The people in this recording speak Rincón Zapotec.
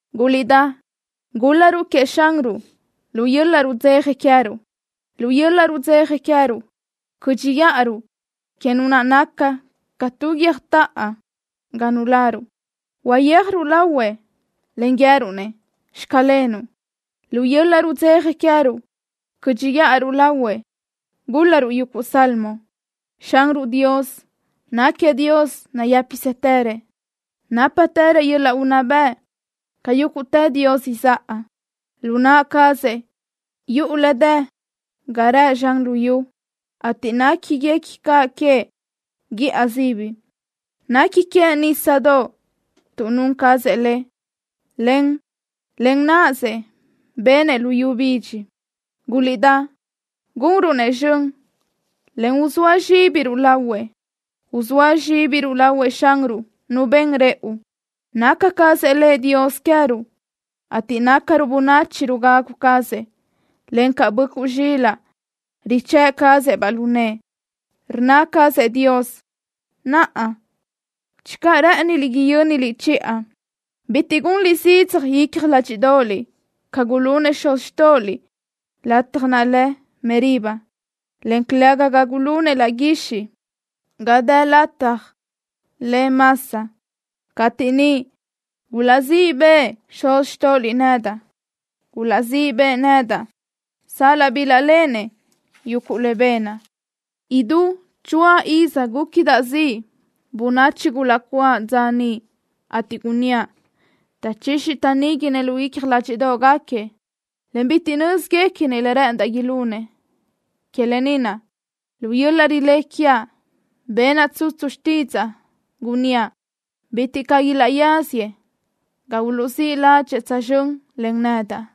Guliʼdá, gúl-laruʼ queëʼ Xanruʼ lu yöl-laʼ rudzeja queë́ruʼ. Lu yöl-laʼ rudzeja queë́ruʼ cö́dxiʼaruʼ que Nu naʼ naca ca tu guiö́jtoʼo ga nuláruʼ. Uyéajruʼ lahuëʼ, en guië́ruʼ-nëʼ: “Xclenuʼ.” Lu yöl-laʼ rudzeja queë́ruʼ cö́dxiʼaruʼ lahuëʼ, gúl-laruʼ yuguʼ salmo. Xanruʼ Dios náquiëʼ Dios nayë́pisëtërëʼ. Nápatërëʼ yöl-laʼ unná bëʼ ca yúguʼtë dios izáʼa. Lu naʼ cazëʼ yuʼu le dë ga rëʼ zxan luyú, ateʼ néquiguequi caʼ queëʼ guíʼa sibi. Nequi queëʼ nísadoʼ, tuʼ nun cazëʼ le, en len náʼasëʼ benëʼ luyú bidxi. Guliʼdá, gunruʼ-nëʼ zxön, en uzóa zxíbiruʼ lahuëʼ. Uzóa zxíbiruʼ lahuëʼ Xanruʼ Nu ben rëʼu. Naca cazëʼ Lëʼ Dios queë́ruʼ, ateʼ nácaruʼ bönachi rugagu cazëʼ, en ca böʼcuʼ zxilaʼ richë́ʼ cazëʼ-baʼ lu nëʼë. Rnna cazëʼ Dios: “Naʼa, channö rë́ʼëniliʼ yö́niliʼ chiʼa, bitiʼ gunliʼ zidzaj icja ládxiʼdoʼoliʼ ca gulunëʼ xuz xtóʼoliʼ lataj naʼ lë Meriba, en calëga ca gulunëʼ laʼ guixiʼ ga dë lataj lë Masa, cateʼ niʼ gulaʼzíʼ bëʼë xuz xtóʼoliʼ nedaʼ. Gulaʼzíʼ bëʼë nedaʼ sal-laʼ bilaʼléʼenëʼ yuguʼ le benaʼ.” Idú choáʼ iz gúquidaʼ ziʼ bönachi gulaʼcuáʼ dza niʼ, ateʼ gunníaʼ: “Taʼchixi taʼníguinëʼ lu icja ládxiʼdoʼgaquiëʼ, en bitiʼ nö́zguequinëʼ le rë́ʼëndaʼ ilunëʼ.” Que lë ni naʼ lu yöl-laʼ rilé quiaʼ benaʼ tsutsu xtídzaʼa, gunníaʼ: “Bitiʼ caʼ ilaʼyáziëʼ ga uluʼzíʼ ládxëʼë tsözxö́n len nedaʼ.”